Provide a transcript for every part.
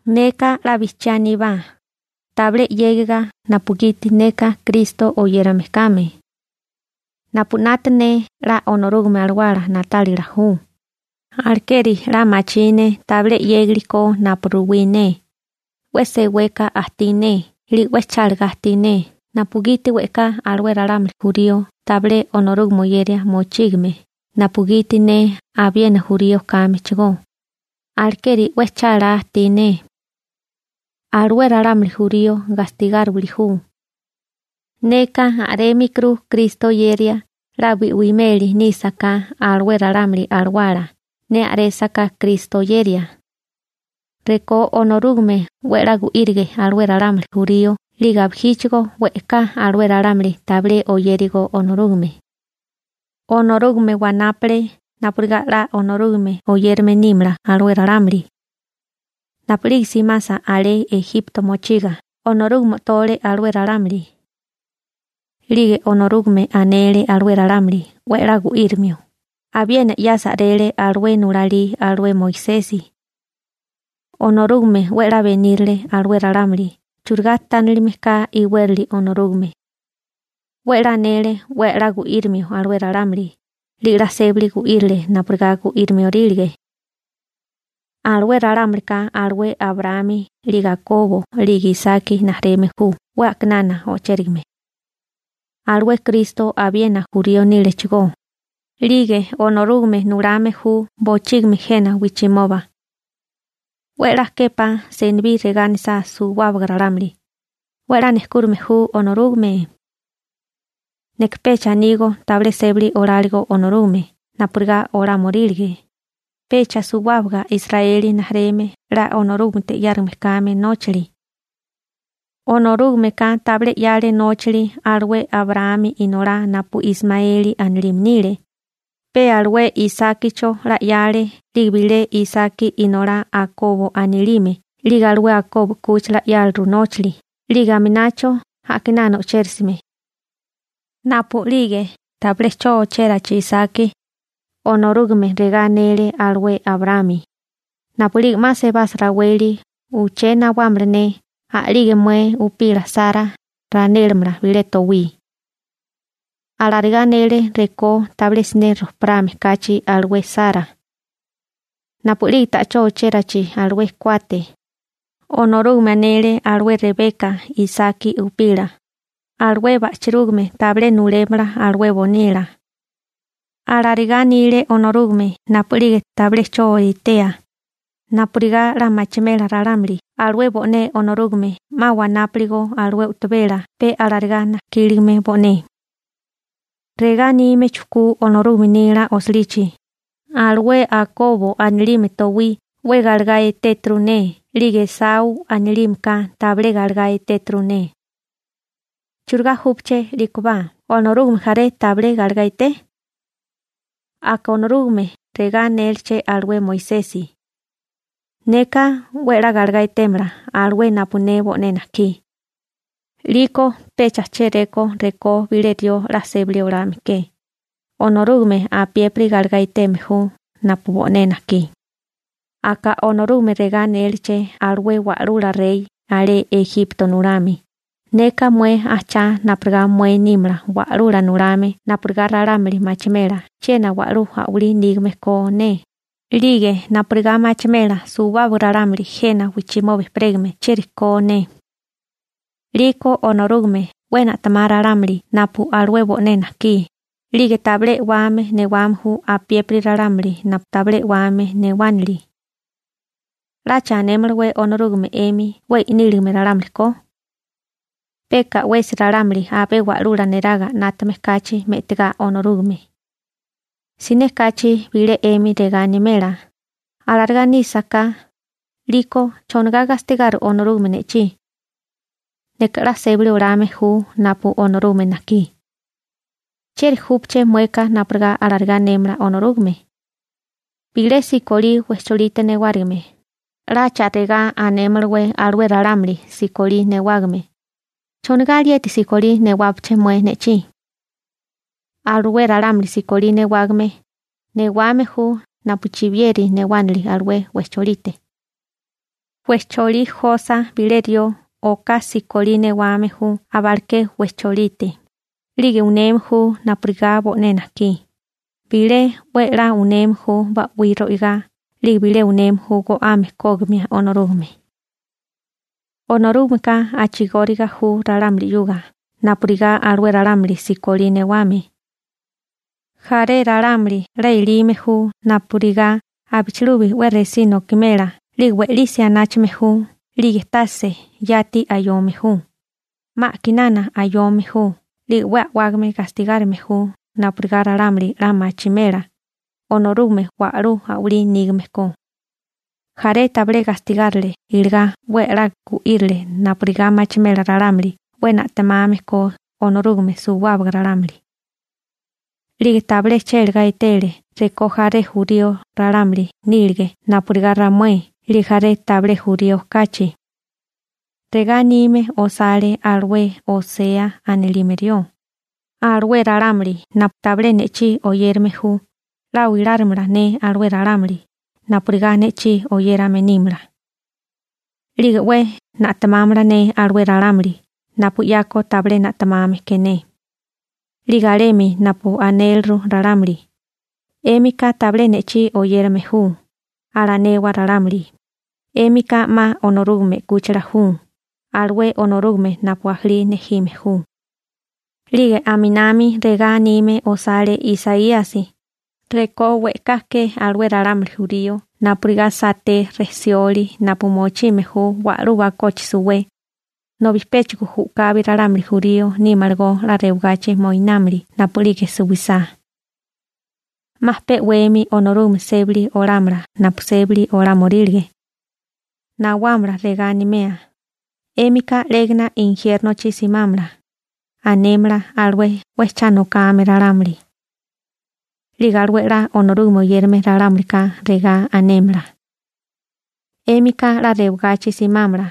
Neka 'la bijchiá aníbá, tabilé 'yégiga napugiti neka Kristo oyérame kame. Napu 'nata ne 'la Onorúgame Alawala na'tálila ju, alekeri 'la machí ne tabilé 'yégali ko napu ruwí ne, 'we seweka ajtí ne 'lige 'we chálagá ajtí ne napugiti we'ká alué ralámuli jurío tabilé Onorúgame oyeria mochígime napugiti ne abiena jurío kámechigó, alekeri 'we chálá ajtí ne. Alué ralámuli jurío gastigáriwili ju. Neka a'rémikuru Kristo oyeria 'la bi'wimeli nísaká alué ralámuli alawala ne a'résaká Kristo oyeria. Rekó Onorúgame 'we 'la gu'írige alué ralámuli jurío 'lige abijíchigo we'ká alué ralámuli tabilé oyérigó Onorúgame. Onorúgame wanápale napurigá 'la Onorúgame oyérame nímala alué ralámuli. Napu'lige simasa alé Ejipto mochiga Onorúgame o'tole alué ralámuli. 'Lige Onorúgame anele alué ralámuli 'we 'la gu'írimio, abiena 'yasa a'rele alué nulalí alué Moisesi. Onorúgame 'we 'la benírale alué ralámuli churigá tánilime ka iwérali Onorúgame. 'We 'la anele 'we 'la gu'írimio alué ralámuli 'lige 'la sébali gu'írile napurigá gu'írimiorílige. Alué ralámulika alué Abraámi 'lige Akobo 'lige Isaki rijimala ju 'we a'kinana o'chérigame. Alué Kristo abiena jurío nílechigó, 'lige Onorúgame nulame ju bochígimi jena wijchimoba. 'We 'la képá senibí regá anisá suwábaga ralámuli: «'We 'la nejkúrime ju Onorúgame.» Neka pecha anígó tabilé sébali oláligo Onorúgame napurigá olámorílige, pecha suwábaga Israeli (Akobo) rijimala 'la Onorúgamete 'yárigame kame nóchali. Onorúgameka tabilé 'yale nóchali alué Abraámi inolá napu Ismaeli anilime nile, pe alué Isákicho 'la 'yale 'lige bilé Isaki inolá Akobo anilime 'lige alué Akobo 'kúchila 'yáliru nóchali 'lige aminacho a'kinana o'chérisime. Napu'lige tabilé 'cho ochérachi Isaki, Onorúgame regá anele alué Abraámi: «Napu'lige 'ma sebasa raweli uché nawámala ne a'lige mué upila Sara ranélamala bilé towí.» Alarigá anele rekó tabilé siné rojparame kachi alué Sara. Napu'lige ta'chó o'chérachi alué kuate, Onorúgame anele alué Rebeka Isaki upila: «Alué ba'chirúgame tabilé nulémala alué bonila.» Alarigá anile Onorúgame napu'lige tabilé 'cho etea, napurigá 'la machimela ralámuli alué bo'né Onorúgame 'ma wanápuligo alué u'tabela pe alarigá najkíligame bo'né. Regá anime chujkú Onorúgame nila osilichi: «Alué Akobo anilime towí 'we galegá etéturu ne 'lige Esaú anilime ka tabilé galegá etéturu ne.» ¿Churigá júpaché 'líkobá? ¿Onorúgame jaré tabilé galegá eté? Aka Onorúgame regá anéleché alué Moisesi: «Neka 'we 'la galegá etémala alué napu ne bo'né najkí.» 'Liko pecha chéréko rekó bilé rió 'la sébali olame ke, Onorúgame apiépiri galegá eteme ju napu bo'né najkí. Aka Onorúgame regá anéleché alué wa'lula rey alé Ejipto nulame: «Neka mué ajchá napurigá mué nímala wa'lula nulame napurigá ralámuli machimela chiena wa'lú a'walí nígame ko ne, 'lige napurigá machimela suwábaga ralámuli jena wijchimoba ejperégame chieri ko ne.» 'Liko Onorúgame 'we na'temá ralámuli napu alué bo'né najkí, 'lige tabilé e'wame newame ju apiépiri ralámuli napu tabilé e'wame newánili. ¿'Lacha anémalawé Onorúgame 'emi 'we i'níligame ralámuli ko? Peka 'wesi ralámuli abé wa'lula neraga 'nátame kachi me'tigá Onorúgame. Siné kachi bilé 'emi regá animela: «Alarigá nísaká, ¿'liko chonigá gastigari Onorúgame ne'chí? Neka 'la sébali olame ju napu Onorúgame najkí.» ¿Chieri júpaché mueka napurigá alarigá anémala Onorúgame? Bilé sikolí wejcholite newárigime 'lacha regá anémalawé alué ralámuli sikolí newágame: «¿Chonigá alieti sikolí newápeché mué ne'chí?» Alué ralámuli sikolí newame, newame ju napu chibiyeri newánili alué wejcholite. Wejcholí josa bilé rió oká sikolí newame ju abaleké wejcholite, 'lige uneme ju napurigá bo'né najkí, bilé 'we 'la uneme ju ba'wí ro'igá 'lige bilé uneme ju go'ame kógimia Onorúgame. Onorúgameka a'chigóriga ju ralámuli 'yuga napurigá alué ralámuli sikolí newame. Jaré ralámuli 'la elime ju napurigá abichilubi 'we resí nokimela 'lige we'lisi anáchame ju 'lige tase yati ayome ju, 'ma a'kinana ayome ju 'lige 'we a'wágame gastigárime ju napurigá ralámuli 'la machimela Onorúgame wa'lú a'walí nígame ko. Jaré tabilé gastigárile iligá 'we 'la gu'írile napurigá machimela ralámuli 'we na'temame ko Onorúgame suwábaga ralámuli. 'Lige tabilé chélagá etele rekó jaré jurío ralámuli nílige napurigá ramué 'lige jaré tabilé jurío kachi. Regá anime osale alué Osea anilime rió: Alué ralámuli napu tabilé ne'chí oyérame ju 'la oilárimala ne alué ralámuli napurigá ne'chí oyérame nímala. 'Lige 'we na'temámala ne alué ralámuli napu 'yako tabilé na'temame ke ne. 'Lige alemi napu anéliru ralámuli: «'Émika tabilé ne'chí oyérame ju», alanewa ralámuli: «'Émika 'ma Onorúgame 'kúchila ju alué Onorúgame napu ajalí nejime ju.» 'Lige aminami regá anime osale Isaíasi: «Rekó we'ká ke alué ralámuli jurío napurigá saté rejsioli napu mochime ju wa'lú bakochi suwé, nobi péchigo u'kabi ralámuli jurío nímalagó 'la rewagachi moinámili napu'lige suwisá. 'Ma pe'wemi Onorúgame sébali olámala napu sébali olámorílige. Nawámala regá animea: 'Émika 'légana injiérnochi simámala, anémala alué 'we cha nokame ralámuli. 'Lige alué 'la Onorúgame oyérame ralámulika regá anémala: 'Émika 'la rewagachi simámala.»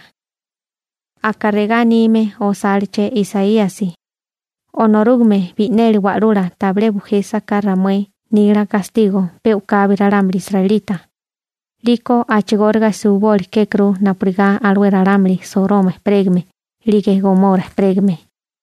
Aka regá anime osáleché Isaíasi: Onorúgame Bi'neli Wa'lula tabilé bujésaká ramué nila gastigo pe u'kabi ralámuli israelita, 'liko a'chigóriga suwiboli kékuru napurigá alué ralámuli Soroma ejperégame 'lige Gomora ejperégame.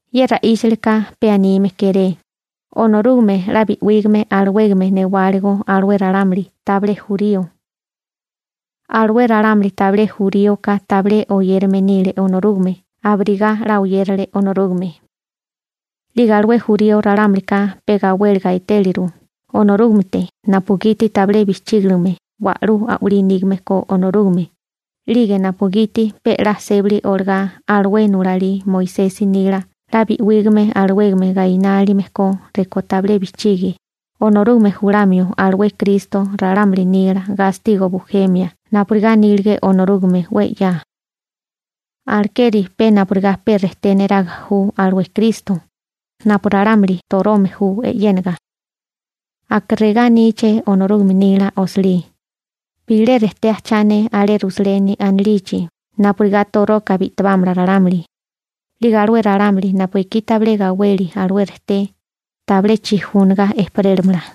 Ye ra'íchilika pe anime kéré: Onorúgame 'la bi'wígame alawégame newáligo alué ralámuli tabilé jurío. Alué ralámuli tabilé juríoka tabilé oyérame nile Onorúgame abirigá 'la oyérale Onorúgame. 'Lige alué jurío ralámulika pe gawéliga etéliru Onorúgamete napugiti tabilé bijchígiligame wa'lú a'walí nígame ko Onorúgame 'lige napugiti pe 'la sébali olagá alué nulalí Moisesi nila 'la bi'wígame alawégame gainánilime ko rekó tabilé bijchígie Onorúgame julamio alué Kristo ralámuli nila gastigo bujemia napurigá anílige Onorúgame 'we 'ya. Alekeri pe napurigá pe rejté neraga ju alué Kristo, napu ralámuli torome ju e'yénaga. Aka regá aníché Onorúgame nila osilí: Bilé rejté ajchá ne alé Rusaleni anilichi (Sioni) napurigá toroka bi'tibámala ralámuli, 'Lige alué ralámuli napu ekí tabilé gaweli alué rejté (Kristo) tabilé chijúniga ejperélamala.